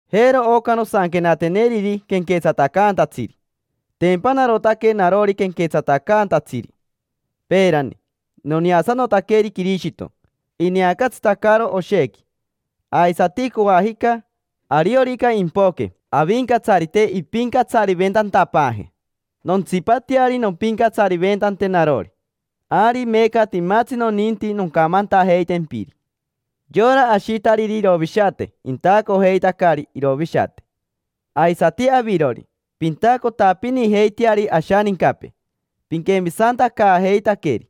Jero oca nosanquenateneriri quenquetsatacaantatsiri. Tempa narotaque narori quenquetsatacaantatsiri. Peerani noneasanotaqueri Quirishito ineacatsitacaro oshequi. Aisati coajica, ariorica impoque Avincatsarite impincatsariventantapaaje, nontsipateari nompincatsariventante narori. Ari meeca timatsi noninti noncamantajeitempiri: yora ashitariri irovishate intacojeitacari irovishate. Aisati avirori, pintacotapinijeiteari ashanincapee piquemisantacaajeitaqueri.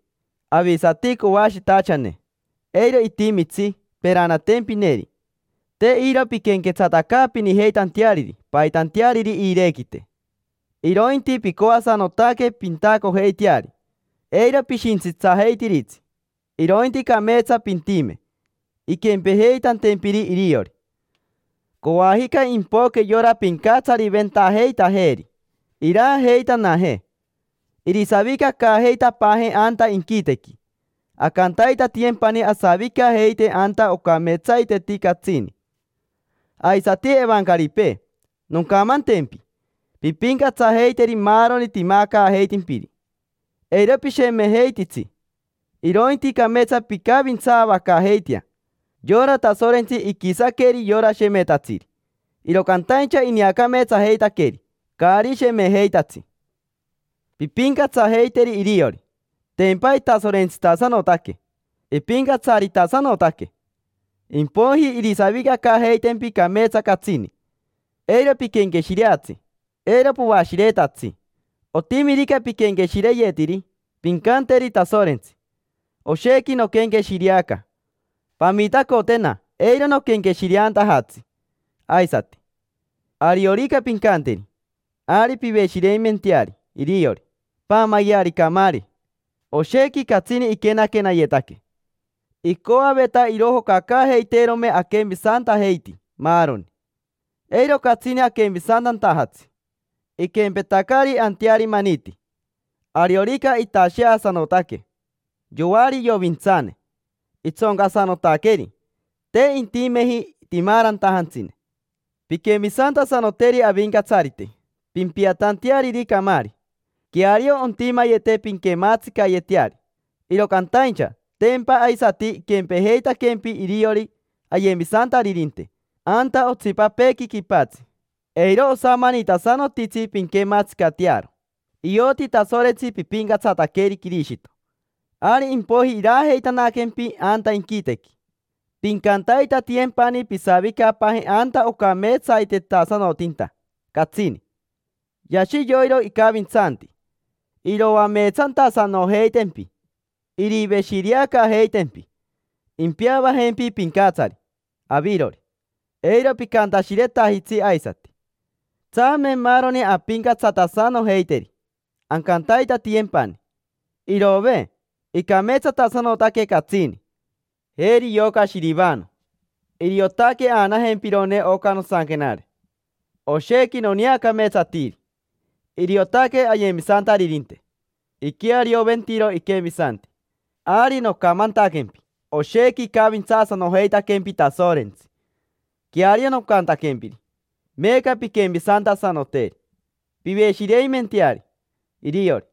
Avisati coashitachane, eiro itimitsi peranatempineri. Te iro pinquenquetsatacaapinijeitanteariri paitanteariri iirequite, irointi pincoasanotaque pintacojeiteari. Eiro pishintsitsajeitiritsi, irointi cameetsa pintime, inquempejeitantempiri iriori. Coajica impoque yora pincatsariventajeitajeeri, iraajeitanajee, irisavicacaajeitapaajee anta inquitequi. Ancantaitatiyempani asavicajeite anta ocameetsaiteti catsini. Aisati evancaripee, noncamantempi: pimpincatsajeiteri maaroni timacaajeitimpiri. Eiro pishemejeititsi, irointi cameetsa pincavintsaavacaajeitea. Yora Tasorentsi iquisaqueri yora shemetatsiri, iro cantaincha ineacameetsajeitaqueri caari shemejeitatsi. Pimpincatsajeiteri iriori: tempa itasorentsitasanotaque, ipincatsaritasanotaque; impoiji irisavicacaajeitempi cameetsa catsini. Eiro piquenqueshireatsi, eiro poashiretatsi. Otimirica piquenqueshireyetiri, pincanteri Tasorentsi: “Oshequi noquenqueshireaca. Pamitacotena eiro noquenqueshireantajatsi aisati”. Ariorica pincanteri, ari piveshireimenteari iriori. Queariompia: paamayeari camaari. Oshequi catsini iquenaquenayetaque, icoaveta irojocacaajeiteerome aquemisantajeiti maaroni: eiro catsini aquemisantantajatsi. Iquempetacari anteari maniti, ariorica itasheasanotaque: yoari iovintsane, itsoncasanotaqueri, te intimeji timaarantajantsine. Pinquemisantasanoteri Avincatsarite pimpiatanteariri camaari. Queario ontimayete pinquematsicayeteari, iro cantaincha tempa aisati iquempejeitaquempi iriori ayemisantaririnte anta otsipapeequi quipatsi. Eiro osamanitasanotitsi pinquematsicatearo: ioti Tasorentsi pipincatsataqueri Quirishito, ari impoiji iraajeitanaquempi anta inquitequi. Pincantaitatiyempani pisavicapaaje anta ocameetsaitetasanotinta catsini. Yashi yoiro icavintsanti: iroameetsantasanojeitempi, iriveshireacaajeitempi, impeavajempi pincatsari avirori, eiro picantashiretajitsi aisati. Tsame maaroni ampincatsatasanojeiteri, ancantaitatiyempani. Iroove, icameetsatasanotaque catsini. Jeri yoca Shirivano, iriotaque aanajempirone oca nosanquenare. Oshequi noneacameetsatiri: iriotaque ayemisantaririnte, iquearioventiro iquemisanti. Ari nocamantaquempi oshequi icavintsaasanojeitaquempi Tasorentsi, queario nocantaquempiri. Meeca pinquemisantasanoteri, piveshireimenteari iriori.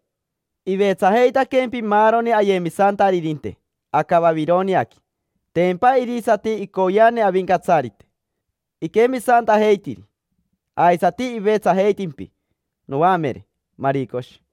Ivetsajeitaquempi maaroni ayemisantaririnte aca Vavironiaqui, tempa irisati icoyeane Avincatsarite iquemisantajeitiri. Aisati ivetsajeitimpi noamere Maricoshi.